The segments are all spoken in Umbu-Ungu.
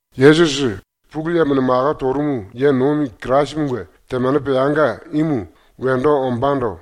⸤Yesusi, Pulu Yemone mako torumu ye nomi Kirasimunge temane peanga imu wendo ombándo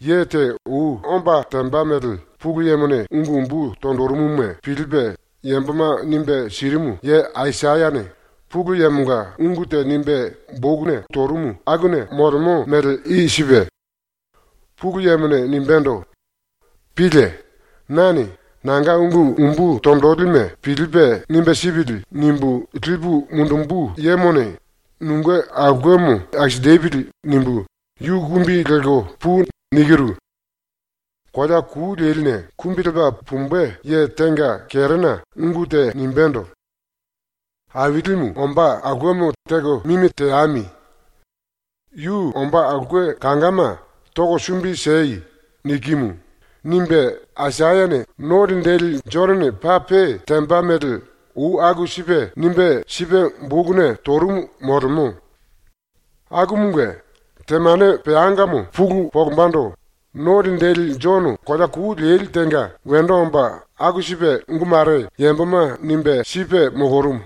ye te ou omba temba mele⸥ Pulu Yemone ungu umbu tonjirimuma pilipe yamboma nimbe sirimu ye Aisayane Pulu Yemonga ungu te nimbe boku torumu akuna molemo mele i sipe: ‘⸤Pulu Yemone nimbendo: “⸤Pílie!⸥ Nane ‘ ‘Nanga ungu umbu tonjilime pilipe nimbe sipili.’ nimbu lipu mundumbu yemone nunge aulkemo akisinjipili.’ nimbu yu “Kumbi lelko pui.” nikiru.’ ‘Kolea ku leline ⸤kumbi lepa pumbe⸥ ye tenga kerena ungu te nimbendo: “Ailimu ombá aulkemo teko mimi teame. Yu ombá aulke kangama toko sumbi siei.” nikimu.’ nimbe ⸤Aisayane Jonone paa pe temba mele ou aku sipe nimbe sipe bokuna torumu molemo.⸥ Akumunge, ⸤temane peangamo pulu monjimbendo No Linjili⸥ Jono kolea ku leli tenga wendo omba ⸤aku sipe⸥ ungu mare yamboma nimbe sipe molorumu.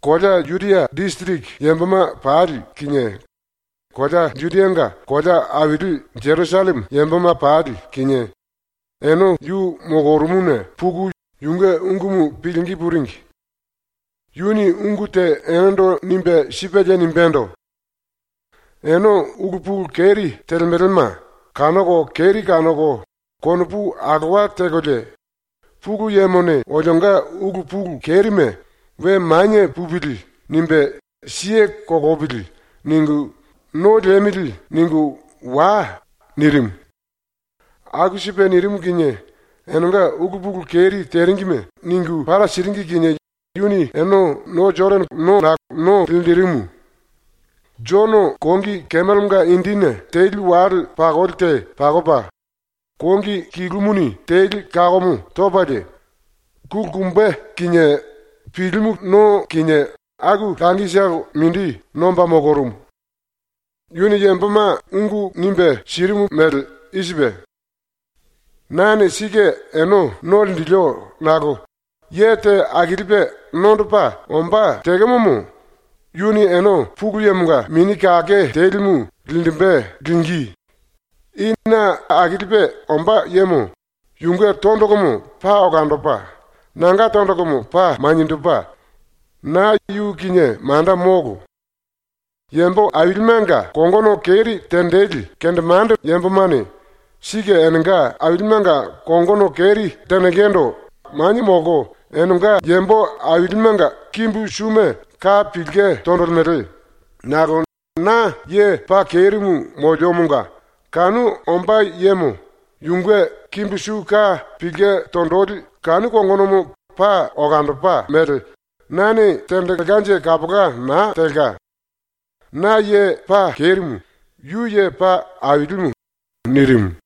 Kolea Judia disiriki yamboma pali kinie kolea Judianga kolea aili Jerusalleme yamboma pali kinie ene yu molorumuna puku yunge ungumu pilingí puringi. Yuni ungu te enendo nimbe sipelie nimbendo: “Ene ulu pulu keri telemelema kanoko keri kanoko konopu alowa tekolie ‘Pulu Yemone olionga ulu pulu kerime ‘We manie pupili.’ nimbe siye kolopili.’ ningu ‘No liemili.’ ningu wai.” nirimu. Aku sipe nirimu kinie enenga ulu pulu keri teringime ningu para siringi kinie yuni ene no Jodane kolo no linjirimu. Jono kongi kemelenga indini teli wale pakoli te pakopa, kongi kilumuni teli kakomo topalie, kulikumbe kinie pilimu no kinie aku langitolo mindi nomba molorumu. Yuni yamboma ungu nimbe sirimu mele i sipe: “Nane sike ene no linjilio nakolo ye te akilipe ⸤nondopa⸥ ombá ⸤tekemo⸥mo yuni ene ⸤Pulu Yemonga⸥ Mini Kake Telimu linjimbe ⸤lingí⸥.. I na akilipe ombá yemo yunge tondolomo paa olandopa, nanga tondolomo paa maniendopa, na yu kinie manda molo. Yambo ailimenga kongono keri tenjili kendemande yambomane sike enenga ailimenga kongono keri tenjingindu manie molko enenga yambo ailimenga kimbu suma ka pilke tonjilimele nakolo na ye paa kerimu moliomonga kanu ombá yemo yunge kimbu su ka pilke tonjili kanu kongonomo paa olandopa mele, nane tenjilkenje kapola naa telka. ⸤Na ye paa kerimu, yu ye paa ailimu.⸥” nirimu.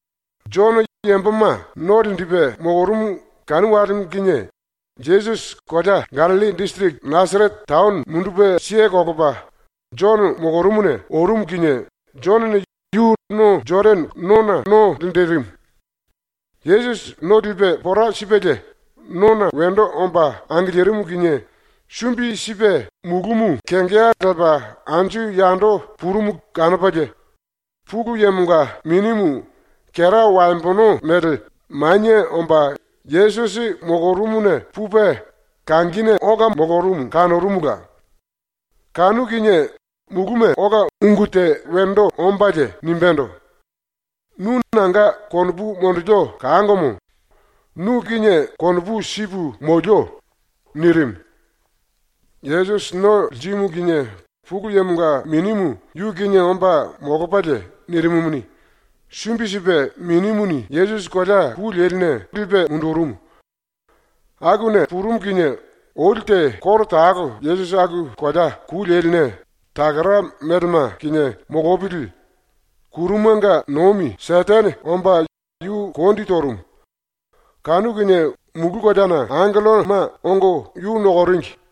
⸤Jono yamboma no linjipe molorumu⸥ kanu walemo kinie Yesusi kolea Gallilli disiriki Nasarete taono mundupe kelepa ⸤Jono molorumuna⸥ orumu kinie Jonone yu no Jodane kolo no linjirimu. ⸤Yesusi no lipe pora sipelie⸥ nona wendo omba angilirimu kinie sumbi sipe mulúmu kengeya lepa anju yando purumu kanopalie, Pulu Yemonga Minimu, kera waembono mele, manie omba Yesusi molorumuna pupe kangine ola molorumu kanorumula. Kanu kinie muluna ola ungu te wendo ombalie nimbendo: “Nu nanga konopu monjilio kangomo. Nu kinie konopu sipu molio.” nirimu. ⸤Yesusi no lirimu kinie Pulu Yemonga Minimu yu kinie omba molopalie nirimumuni,⸥ sumbi sipe Minimuni Yesusi kolea ku leline pulu sipe mundurumu. ⸤Akuna purumu kinie,⸥ oli te koro talo Yesusi aku kolea ku leline takara melema kinie molopili ⸤kurumanga nomi⸥ Setene omba yu kondi torumu. Kanu kinie ⸤mulu koleana⸥ angelloma ongo yu nokoringi.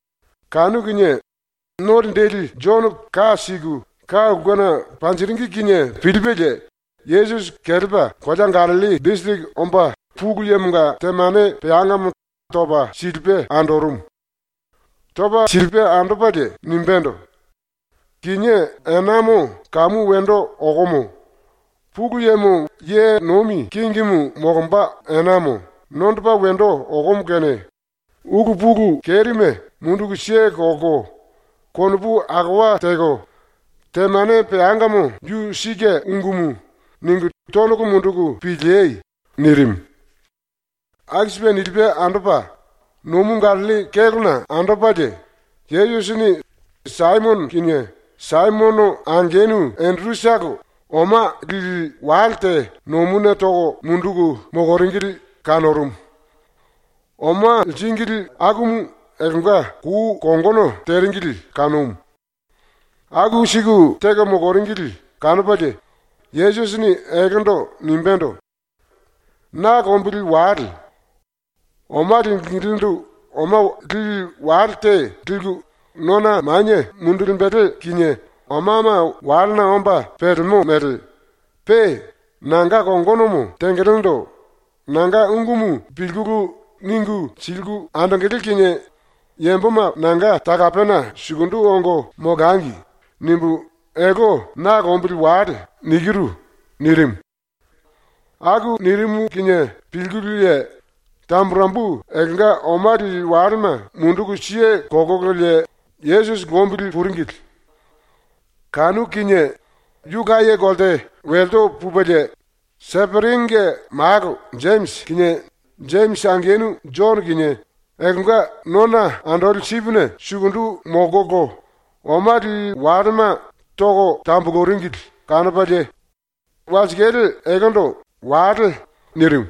Kanu kinie ⸤No Linjili⸥ Jono ka siku ka ulkena panjiringi kinie pilipelie Yesusi kelepa kolea Gallilli disiriki omba Pulu Yemonga temane peangamo topa silipe andorumu. ⸤Topa silipe andopalie⸥ nimbendo: “Kinié enamo kamu wendo okomo, Pulu Yemo ye nomi kingimu molomba enamo nondopa wendo okomo kene ulu pulu kerime munduku kelko konopu alowa teko, ‘Temane peangamo yu sike ungumu.’ ningu tondolo munduku piliei.” nirimu. ⸤Aku sipe nilipe andopa⸥ nomu Gallilli kélona andopalie Yesusini Saimono kinie Saimono angenu Enderutolo oma lili wale te nomuna toko munduku moloringili kanorumu. Oma liringili akumu eltenga kou kongono teringili kanumu. ⸤Aku siku teko moloringili kanopalie⸥ Yesusini eltendo nimbendo: “Na lombili wale. Oma lingilindu oma lili wale te liku nona manie mundulimbele kinie omama walena omba pelemo mele, pe ‘nanga kongonomo tengelendo nanga ungumu pilkulu ningu siliku andongele kinie yamboma nanga talapena sukundu ongo molangi.’ nimbu ‘Elte na lombili wale.’ nikiru.” nirimu. ⸤Aku nirimu kinie pilkululie⸥ tamburembu eltenga oma lili walema munduku kelkololie Yesusi lombili puringili. ⸤Kanu kinie⸥ yu laye kolte wilsu pupelie, Seperinge malo Jemisi kinie Jemisi angenu Jono kinie eltenga nona andoli sipine sukundu molkolo oma lili walema toko tambuluringili kanopalie walsikale eltendo “Wale.” nirimu.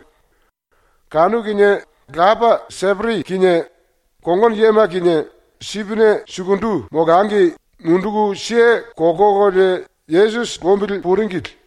Kanu kinie lapa Seperi kinie kongono yema kinie sipine sukundu molangi munduku kelkololie Yesusi lombili puringili.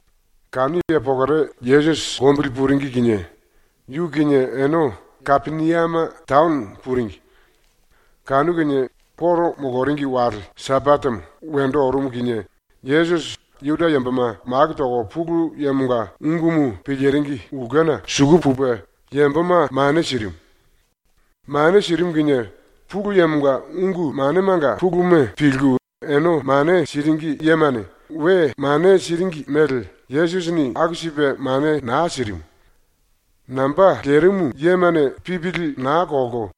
⸤Kanu ye pokore Yesusi lombili puringi kinie⸥ yu kinie ene Kapeniame taono puringi. Kanu kinie ⸤Juda yambomanga⸥ koro moloringi wale Sambatemo wendo orumu kinie Yesusi Juda yamboma maku toko Pulu Yemonga ungumu piliringi ulkena suku pupe yamboma mane sirimu. Mane sirimu kinie Pulu Yemonga ungu manemanga puluma pilku ene mane siringi yemane we mane siringi mele Yesusini aku sipe mane naa sirimu. Namba lerimu yemane pipili naa kolko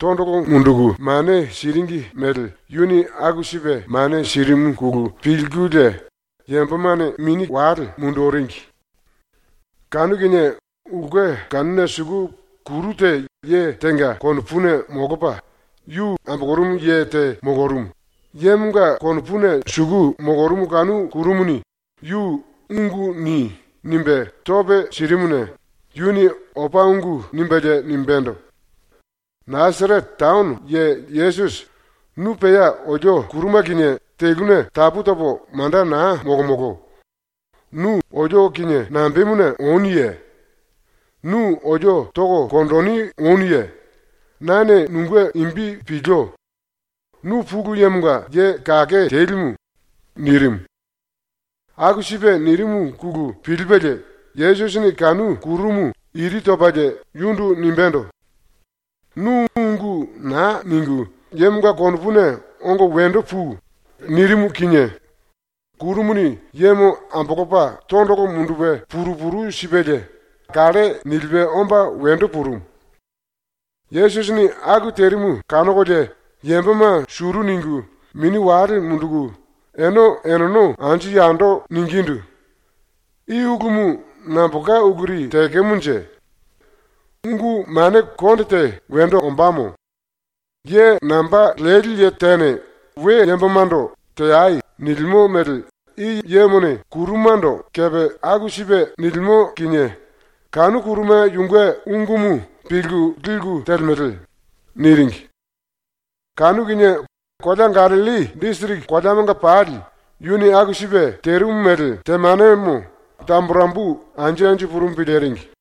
tondolo munduku mane siringi mele yuni aku sipe mane sirimuna pilkulie yambomane mini wale munduringi. Kanu kinie ulke kanuna suku kuru te ye tenga konopuna molopa ya ambolorumu ye te molorumu, ⸤yemonga konopuna suku molorumu kanu kurumuni yu “Ungu ni.” nimbe tópe sirimuna⸥ yuni opa ungu nimbelie nimbendo: “Nasarete taono ye Yesusi, nu pea olio ⸤kuruma⸥ kinie teluna tapu topo manda naa molomolo. Nu olio kinie nambemuna onuye? Nu olio toko konjini onuye? Nane nunge imbi pilio. Nu Pulu Yemonga Ye Kake Telimu.” nirimu. ⸤Aku sipe nirimuna pilipelie⸥ Yesusini kanu kurumu iri topalie yundu nimbendo: “Nu ungu naa ningu yemonga konopuna ongo wendo pui.” nirimu kinie kurumuni yemo ambolopa tondolo mundupe puru puru sipelie kalle nilipe omba wendo purumu. ⸤Yesusini aku terimu kanokolie⸥ yamboma suru ningu, mini wale munduku ene eneno anju yando ningindu: “I ulumu nambolka uluri tekemonje? Ungu mane konde te wendo ombamo. Ye namba leli tene we yambomando “Teai.” nilimo mele i yemone kurumando kepe aku sipe nilimo kinie kanu kuruma yunge ungumu pilku liku telemele.” niringi. Kanu kinie kolea Gallilli disiriki koleamanga pali yuni aku sipe terimu mele temanemo tamburembu anju anju purumu piliringi.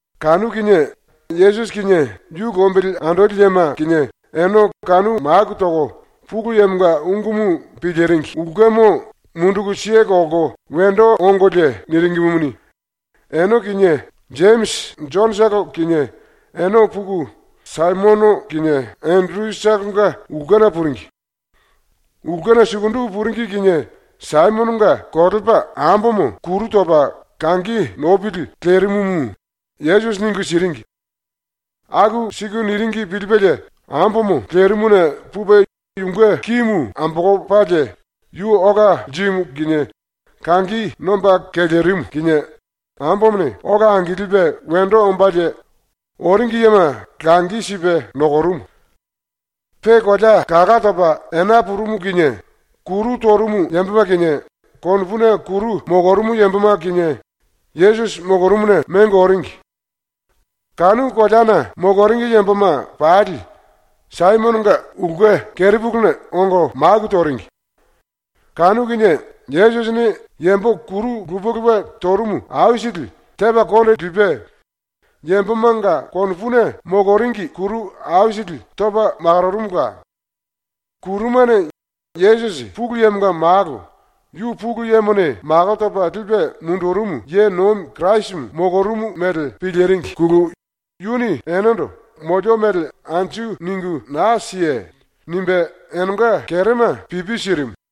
Kanu kinie ⸤Yesusi kinie, yu lombili andoli yema kinie⸥ ene kanu maku toko Pulu Yemonga ungumu piliringi ulkemo munduku kelko wendo ongolie niringimuni, ene kinie, Jemisi Jonotolo kinie ene puku Saimono kinie Enderutolonga ulkena puringi. Ulkena sukundu puringi kinie Saimononga kolepa ambomo kuru topa kangi nopili lerimumu Yesusi ningu siringi. Aku siku niringi pilipelie ambomo lerimuna pupe yunge kimu ambolopalie yu ola lirimu kinie kangi nomba kelerimu kinie ambomone ⸤ola angilipe wendo ombalie⸥ oringi yema langi sipe nokorumu. Pe kolea kalá topa ena purumu kinie, kuru torumu yamboma kinie, konopuna kuru molorumu yamboma kinie, Yesusi molorumuna mengo oringi. Kanu koleana moloringi yamboma pali Saimononga ulke kerepuluna ongo maku toringi. Kanu kinie Yesusini yambo kuru lupe lupe torumu aisili tepa konde lipe, yambomanga konopuna moloringi kuru aisili topa makororumula. Kurumane Yesusi ⸤Pulu Yemonga Malo, yu Pulu Yemone mako topa lipe mundurumu ye nomi Kirasimu⸥ molorumu mele piliringine yuni enendo “Molio mele anju ningu naa siei.” nimbe enenga kerema pipi sirimu.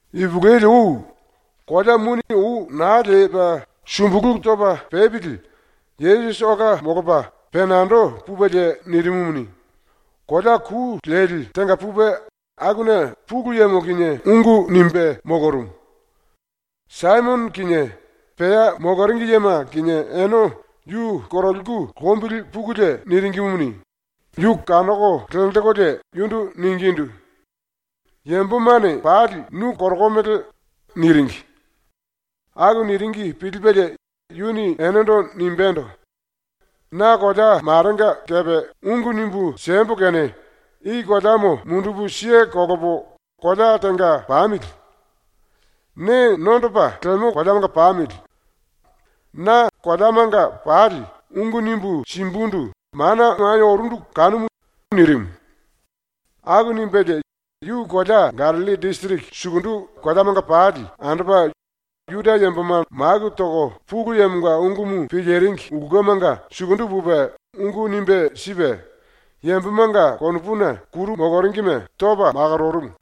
Ipulueli ou, kolea muni ou naa lepa sumbulu topa pepili Yesusi ola molopa penando pupelie nirimumuni, kolea ku leli tenga pupe, akuna Pulu Yemo kinie ungu nimbe molorumu. Saimono kinie pea moloringi yema kinie ene yu koroliku lombili pukulie niringimuni, yu kanoko lenjikulie yundu ningindu: “Yambomane pali nu korokomele.” niringi. ⸤Aku niringi pilipelie⸥ yuni enendo nimbendo: “Na kolea marenga kepe ungu nimbu siembo kene i koleamo mundupu kelepo kolea tenga pamili. Ne nondopa lemo koleamanga pamili. Na koleamanga pali ungu nimbu simbundu mana manie orundu kanumu.” nirimu. Aku nimbelie yu kolea Gallilli disiriki sukundu koleamanga pali andopa Juda yamboma maku toko Pulu Yemonga ungumu piliringi ulkemanga sukundu pupe ungu nimbe sipe, yambomanga konopuna kuru moloringime topa makororumu.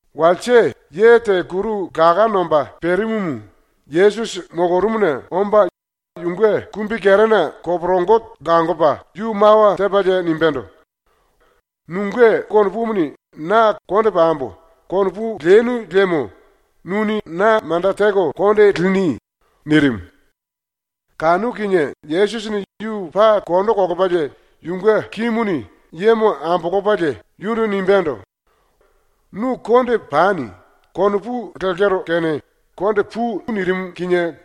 Walse ye te kuru laká nomba perimumu Yesusi molorumuna omba yunge kumbikerena koporongo langopa yu mawa tepalie nimbendo: “Nunge konopumuni na ‘Konde pambo.’ konopu lenu liemo nuni na manda teko konde lini.” nirimu. Kanu kinie Yesusini yu paa kondo kolopalie yunge kimuni yemo ambolopalie yundu nimbendo: “‘Nu konde pani.’ konopu lekero kene konde pui.” nirimu kinie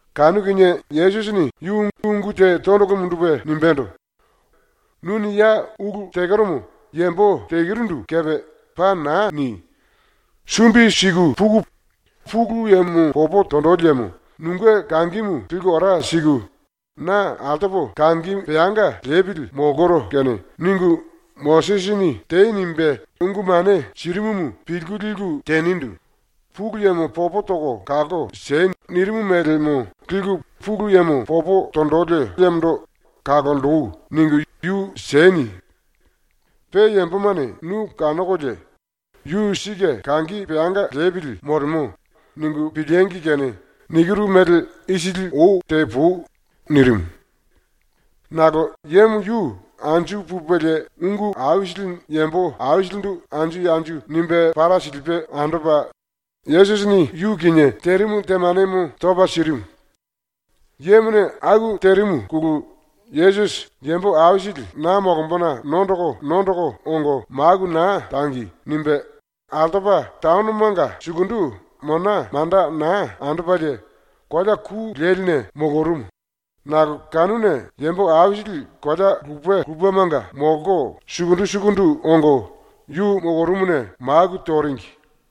Kanu kinie Yesusini yu ungu te tondolo mundupe nimbendo: “Nuni ya ulu tekeromo yambo telurindu kepe paa naa ni! Sumbi siku puku Pulu Yemo popo tonjili yemo nunge kangimu liku ora siku, ‘Na altopo kangi peanga lepili molkoro kene.’ ningu Mosisini “Tei.” nimbe ungu mane sirimumu pilku liku tenindu “Pulu Yemo popo toko kalko si.” nirimu mélemo liku Pulu Yemo popo tonjili yemondo “Kalonji.” ningu yu sieni. Pe yambomane nu kanokolie ‘Yu sike kangi peanga lepili molemo.’ ningu piliengi kene nikiru mele isili ou tepui.” nirimu. Nakolo yemo yu anju pupelie ungu aisili yambo aisilindu anju anju nimbe para silipe andopa, Yesusini yu kinie terimu temanemo topa sirimu. Yemone aku terimuna Yesusi ⸤‘Yambo aisili na molombona nondoko nondoko ongo maku naa tangi.’ nimbe⸥ altopa taonomanga sukundu mona manda naa andopalie kolea ku leline molorumu, nakolo kanuna yambo aisili kolea lupe lupemanga molko sukundu sukundu ongo yu molorumuna maku toringi.